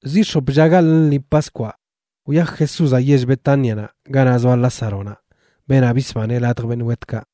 Ziꞌ x̱op lla gaḻꞌ lṉi Paskwaꞌ wyaj Jesúzaꞌ yell Betánianaꞌ, ganaꞌ zoa Lázaronaꞌ, beenaꞌ bisbaneꞌ ladj beṉꞌ wetkaꞌ.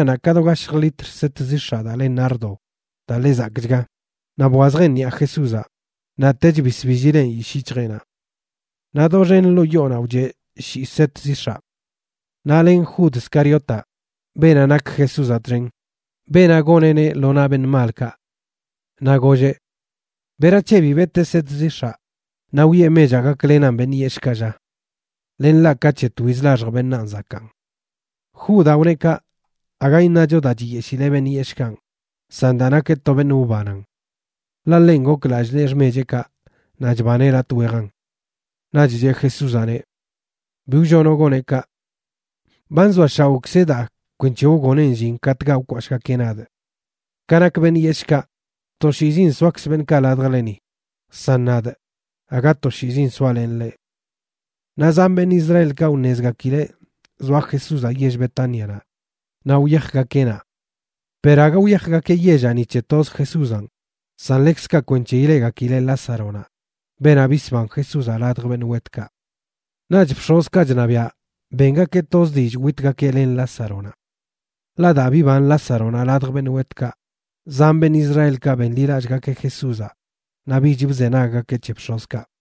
Naꞌch bex̱ꞌ Maríanaꞌ ka do gashj litr set zix̱aꞌ daa le nardo, daa ḻe zakꞌchga, naꞌ bwazjeꞌn ṉiꞌa Jesúzaꞌ, naꞌ tech bisbillileꞌn yishꞌ yic̱hjeꞌnaꞌ. Naꞌ doxen ḻoo yoonaꞌ wcheꞌ shii set zix̱aꞌ. Naꞌ len Jud Scariotaꞌ, beenaꞌ nak Jesúzaꞌ txen, beenaꞌ goneꞌneꞌ lo naꞌ beṉꞌ malkaꞌ. Naꞌ golleꞌ: ―¿Berac̱he bi betee set zix̱aꞌ naꞌ wiꞌe mechaꞌ gaklenan beṉꞌ yeshꞌkaꞌ, lla? Len ḻaꞌ ka c̱he twiz laxj beṉaan zakaan. Judaꞌ wneꞌ kaꞌ aga iṉacho daa chiyeshileꞌ beṉꞌ yeshꞌkanꞌ, san daa nakeꞌ to beṉꞌ wbanan. Ḻaꞌ ḻenꞌ gok lallꞌ nee xmecheꞌkaꞌ naꞌ chbaneꞌ latꞌ wejan. Naꞌch cheꞌ Jesúzaꞌneꞌ: ―Bi wllonoꞌ goneꞌ kaꞌ. Ba nzoashaoꞌkzeꞌ daa kwenc̱he wgoneꞌn llin katꞌkaꞌ wkwashꞌgakeꞌ nadꞌ. Ka nak beṉꞌ yeshꞌkaꞌ, toshiizin soakz beṉꞌkaꞌ ladjleni, san nadꞌ, aga toshiizin soalenꞌ leꞌ. Naꞌ zan beṉꞌ Israelkaꞌ wṉezgakileꞌ zoa Jesúzaꞌ yell Betánianaꞌ naꞌ wyajgakeꞌ naꞌ. Per aga wyajgakeꞌ yellaꞌ ni c̱he toz Jesúzanꞌ, san ḻekzkaꞌ kwenc̱he ileꞌgakileꞌ Lázaronaꞌ, beenaꞌ bisban Jesúzaꞌ ladj beṉꞌ wetkaꞌ. Naꞌch bx̱ozkaꞌ chṉabiaꞌ bengakeꞌ toz dillꞌ witgakeꞌ len Lázaronaꞌ. Ḻaꞌ daa biban Lázaronaꞌ ladj beṉꞌ wetkaꞌ, zan beṉꞌ Israelkaꞌ benḻilallꞌgakeꞌ Jesúzaꞌ naꞌ bich bzenaggakeꞌ c̱he bx̱ozkaꞌ.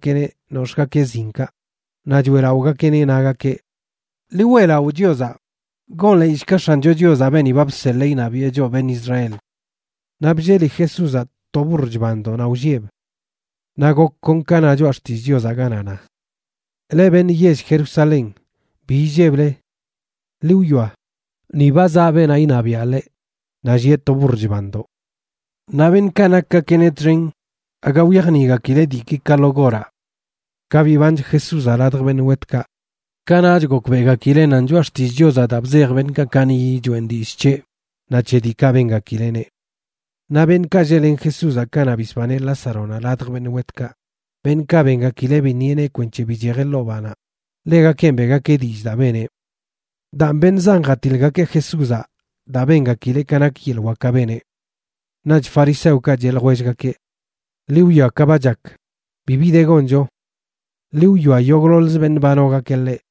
Naꞌch wyajgakeꞌ jḻezgakeꞌneꞌ nox̱ꞌgakeꞌ zinkaꞌ, naꞌ choeꞌlaꞌogakeꞌneꞌ, nagakeꞌ: ―¡Ḻi weꞌlaꞌo Chiozaꞌ! ¡Gonḻeeyshga X̱ancho Chiozaꞌ beeni ba bseḻee iṉabiꞌe choꞌ beṉꞌ Israel! Naꞌ blleli Jesúzaꞌ to burr chbandoꞌ naꞌ wllieꞌb. Naꞌ gok kon ka na Choꞌa Xtillꞌ Chiozaꞌ, ganaꞌ na: Leꞌ beṉꞌ yell Jerusalén, bi illeble. Ḻi wwia, ni ba zaꞌ beenaꞌ iṉabiaꞌ leꞌ naꞌ llieꞌ to burr chbandoꞌ. Naꞌ beṉꞌkaꞌ nakgakeꞌneꞌ txen aga wyajniꞌgakileꞌ diiki ka lo goraꞌ. Ka bibanch Jesúzaꞌ ladj beṉꞌ wetkaꞌ, kanaꞌch gokbeꞌgakileꞌ nan Choꞌa Xtillꞌ Chiozaꞌ daa bzej beṉꞌkaꞌ kaniꞌyi choeꞌn dillꞌ c̱heꞌ, naꞌ c̱he diikaꞌ bengakileꞌneꞌ. Naꞌ beṉꞌkaꞌ lleꞌlen Jesúzaꞌ kanaꞌ bisbaneꞌ Lázaronaꞌ ladj beṉꞌ wetkaꞌ, beṉꞌkaꞌ bengakileꞌ biṉieꞌneꞌ kwenc̱he bichejeꞌ ḻoo banaꞌ, ḻegakenꞌ beꞌgakeꞌ dillꞌ daa beneꞌ. Daan beṉꞌ zan jatiḻgakeꞌ Jesúzaꞌ daa bengakileꞌ ka nak yeḻꞌ wakaꞌ beneꞌ. Naꞌch fariseokaꞌ cheꞌ ljwellgakeꞌ: ―Ḻi wwia ka ba chak, bibi de goncho. Ḻi wwia, yogꞌḻoḻzə beṉꞌ ba nogakeꞌ ḻeꞌ.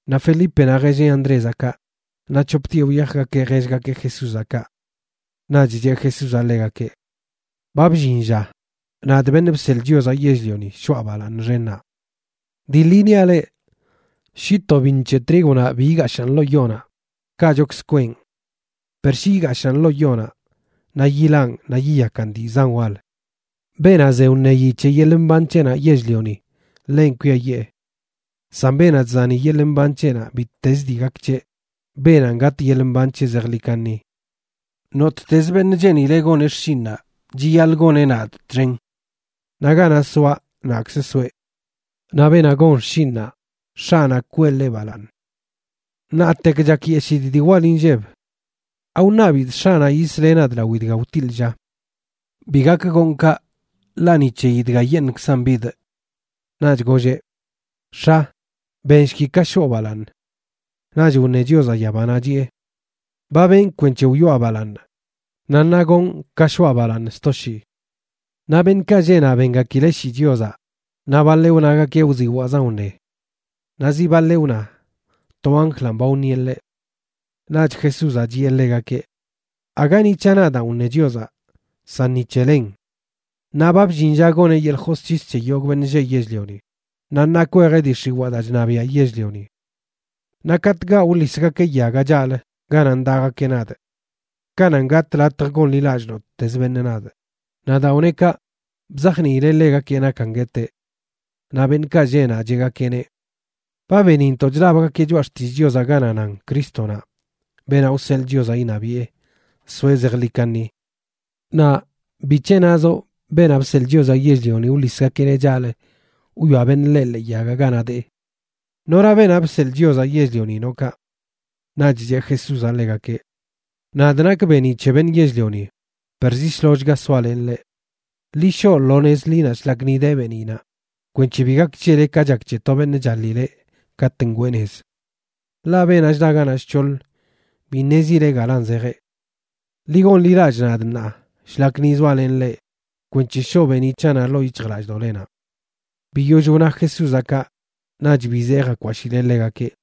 Naꞌ Felípenaꞌ jelleꞌ Andrézaꞌ kaꞌ, naꞌ c̱hoptieꞌ wyajgakeꞌ jellgakeꞌ Jesúzaꞌ kaꞌ. Naꞌch cheꞌ Jesúzaꞌ ḻegakeꞌ: ―Ba bllin lla, nadꞌ, Beṉꞌ Bseḻꞌ Chiozaꞌ Yell-lioni, shoꞌa balaaṉ xennaꞌ. Dii ḻi niaꞌ leꞌ, shi to biṉ c̱he trígonaꞌ bi igashaꞌn ḻoo yonaꞌ, kaꞌchokzə kweꞌn. Per shi igashaꞌn ḻoo yonaꞌ, naꞌ yilaꞌn naꞌ yiyakan dii zan wal. Beenaꞌ ze wṉeyi c̱he yeḻꞌ mban c̱heꞌnaꞌ yell-lioni, ḻenꞌ kwiayee. San beenaꞌ chzani yeḻꞌ mban c̱heꞌnaꞌ bittezə dii gak c̱heꞌ, beenanꞌ gatꞌ yeḻꞌ mban c̱heꞌ zejḻi kaṉi. Nottezə beṉꞌ cheenileꞌ goneꞌ xshinꞌnaꞌ chiyaḻꞌ goneꞌ nadꞌ txen. Naꞌ ganaꞌ soaꞌ, naꞌkzə soeꞌ. Naꞌ beenaꞌ gon xshinꞌnaꞌ, X̱aꞌnaꞌ kwee ḻeꞌ balaaṉ. ’Ṉaatek chakyeshidꞌ dii wal inlleb. ¿Awṉabidꞌ X̱aꞌnaꞌ yisleꞌ nadꞌ lawi dga wtiḻꞌ, lla? Bi gak gonꞌ kaꞌ, ḻaꞌ ni c̱heyi dgayeṉꞌkzan bidꞌ. Naꞌch golleꞌ: ―X̱a, benshki ka shoo balaaṉ. Naꞌch wṉe Chiozaꞌ yabanaꞌ, chiꞌe: ―Ba benꞌ kwenc̱he wyoꞌa balaaṉ, naꞌ ṉaa gonꞌ ka shoꞌa balaaṉ sto shii. Naꞌ beṉꞌkaꞌ lleꞌ naꞌ bengakileꞌ shii Chiozaꞌ, naꞌ baḻeꞌ wnagakeꞌ wziwaꞌzan wṉe. Naꞌ zi baḻeꞌ wna to anjlanꞌ ba wṉieꞌ ḻeꞌ. Naꞌch Jesúzaꞌ chiꞌe ḻegakeꞌ: ―Aga ni c̱haꞌ nadaan wṉe Chiozaꞌ, san ni c̱he lenꞌ. Naꞌ ba bllin lla goneꞌ yeḻꞌ josc̱his c̱he yogꞌ beṉꞌ lleꞌ yell-lioni, naꞌ ṉaa kwejeꞌ dii x̱iwaa daa chṉabiaꞌ yell-lioni. Naꞌ katꞌkaꞌ wḻisgakeꞌ yagaꞌ chaꞌlə ganaꞌ ndaꞌgakeꞌ nadꞌ, kananꞌ gatꞌ latj gonḻilallꞌ nottezə beṉꞌ nadꞌ. Naꞌ daa wneꞌ kaꞌ, bzajniileꞌ ḻegakeꞌ nakan gueteꞌ. Naꞌ beṉꞌkaꞌ lleꞌ naꞌ cheꞌgakeꞌneꞌ: ―Ba benintoꞌ chlabgakeꞌ Choꞌa Xtillꞌ Chiozaꞌ ganaꞌ nan Crístonaꞌ, beenaꞌ wseḻꞌ Chiozaꞌ iṉabiꞌe, soeꞌ zejḻi kaṉi. Naꞌ ¿bic̱he nazoꞌ Beenaꞌ Bseḻꞌ Chiozaꞌ Yell-lioni wḻisgakeꞌneꞌ chaꞌlə wwia beṉꞌ ḻeꞌ ḻee yagaꞌ ganaꞌ dee? ¿Nora Beenaꞌ Bseḻꞌ Chiozaꞌ Yell-lioni noꞌ kaꞌ? Naꞌch cheꞌ Jesúzaꞌ ḻegakeꞌ: ―Nadꞌ nakꞌ beeniꞌ c̱he beṉꞌ yell-lioni, per zi shlollchga soalenꞌ leꞌ. Ḻi shoꞌ lo nez ḻinaꞌ shlak ni de beeniꞌnaꞌ kwenc̱he bi gak c̱hele ka chak c̱he to beṉꞌ chaḻileꞌ katꞌ ngweeꞌ nez. Ḻaꞌ beenaꞌ chdaꞌ ganaꞌ shc̱hoḻ bi ṉezileꞌ galan zejeꞌ. Ḻi gonḻilallꞌ nadꞌ ṉaa shlak ni zoalenꞌ leꞌ kwenc̱he shoꞌ beeniꞌ c̱haꞌnaꞌ ḻoo yic̱hjlallꞌdoꞌlenaꞌ. Biyoll wna Jesúzaꞌ kaꞌ naꞌch bizee jakwashiꞌleꞌ ḻegakeꞌ.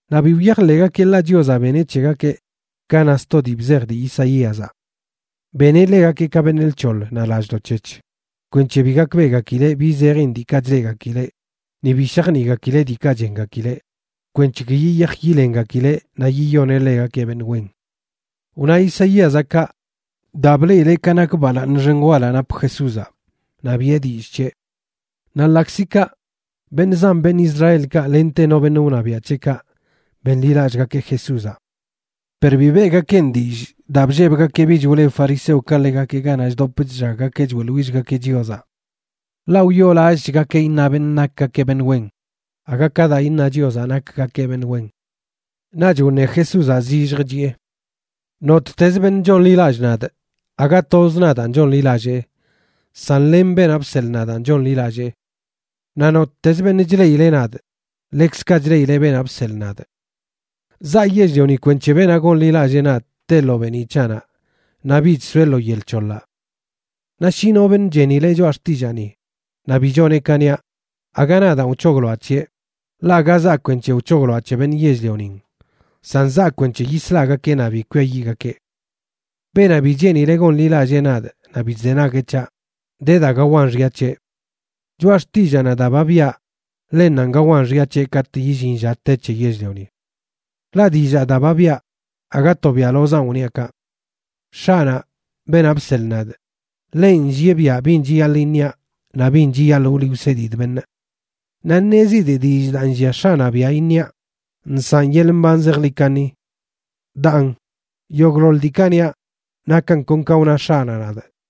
Naꞌ bi wyajḻeꞌgakeꞌ, ḻaꞌ Chiozaꞌ beneꞌ c̱hegakeꞌ ka na sto dii bzej dii Isaíazaꞌ: Beneꞌ ḻegakeꞌ ka beṉꞌ lc̱hoḻ naꞌ lallꞌdoꞌ c̱hec̱h kwenc̱he bi gakbeꞌgakileꞌ bi zejin diikaꞌ chleꞌgakileꞌ, ni bi shajniꞌgakileꞌ diikaꞌ chengakileꞌ, kwenc̱he ki yiyaj yilengakileꞌ naꞌ yiyoneꞌ ḻegakeꞌ beṉꞌ wen. Wna Isaíazaꞌ kaꞌ daa bleꞌileꞌ ka nak balaaṉ xen walaꞌ nap Jesúzaꞌ, naꞌ biꞌe dillꞌ c̱heꞌ. Naꞌ ḻaꞌkzi kaꞌ, beṉꞌ zan beṉꞌ Israelkaꞌ lente no beṉꞌ wṉabiaꞌ c̱heꞌkaꞌ benḻilallꞌgakeꞌ Jesúzaꞌ. Per bi beꞌgakeꞌn dillꞌ daa bllebgakeꞌ bich wleb fariseokaꞌ ḻegakeꞌ ganaꞌ chdop chllaggakeꞌ choeꞌḻwillgakeꞌ Chiozaꞌ, ḻaꞌ wyoolallꞌchgakeꞌ iṉa beṉꞌ nakgakeꞌ beṉꞌ wen aga ka daa iṉa Chiozaꞌ nakgakeꞌ beṉꞌ wen. Naꞌch wṉe Jesúzaꞌ zillj chiꞌe: ―Nottez beṉꞌ chonḻilallꞌ nadꞌ, aga tozꞌ nadaan chonḻilallee, san len beenaꞌ bseḻꞌ nadaan chonḻilallee. Naꞌ nottezə beṉꞌ chleꞌileꞌ nadꞌ, ḻekzkaꞌ chleꞌileꞌ beenaꞌ bseḻꞌ nadꞌ. Zaa yell-lioni kwenc̱he beenaꞌ gonḻilallee nadꞌ teꞌ lo beeniꞌ c̱haꞌnaꞌ naꞌ bich soeꞌ lo yel c̱hoḻaꞌ. Naꞌ shi no beṉꞌ chenileꞌ choꞌa xtillaani naꞌ bi choneꞌ ka niaꞌ, aga nadaan wc̱hogloaꞌ c̱heꞌ, ḻaꞌ aga zaa kwenc̱he wc̱hogloaꞌ c̱he beṉꞌ yell-lionin, san zaa kwenc̱he yislagakee naꞌ bi kwiayiꞌgakeꞌ. Beenaꞌ bi cheenileꞌ gonḻilallee nadꞌ naꞌ bi chzenagueꞌ c̱haꞌ, de daa gawan xya c̱heꞌ. Choꞌa xtillaanaꞌ daa ba biꞌa, ḻennanꞌ gawan xya c̱heꞌ katꞌ illin lla te c̱he yell-lioni. Ḻaꞌ dillaa daa ba biꞌa aga to biaꞌlozanꞌ wniaꞌ kaꞌ. X̱aꞌnaꞌ, beenaꞌ bseḻꞌ nadꞌ, ḻenꞌ nllieꞌ biaꞌ bin chiyaḻꞌ iṉiaꞌ naꞌ bin chiyaḻꞌ wliꞌ wsedidꞌ beṉꞌ. Naꞌ ṉezidꞌ dillꞌ daa nllia X̱aꞌnaꞌ biaꞌ iṉiaꞌ nsaꞌn yeḻꞌ mban zejḻi kaṉi. Daan, yogꞌḻoḻ diikaꞌ niaꞌ, nakan kon ka wna X̱aꞌnaꞌ nadꞌ.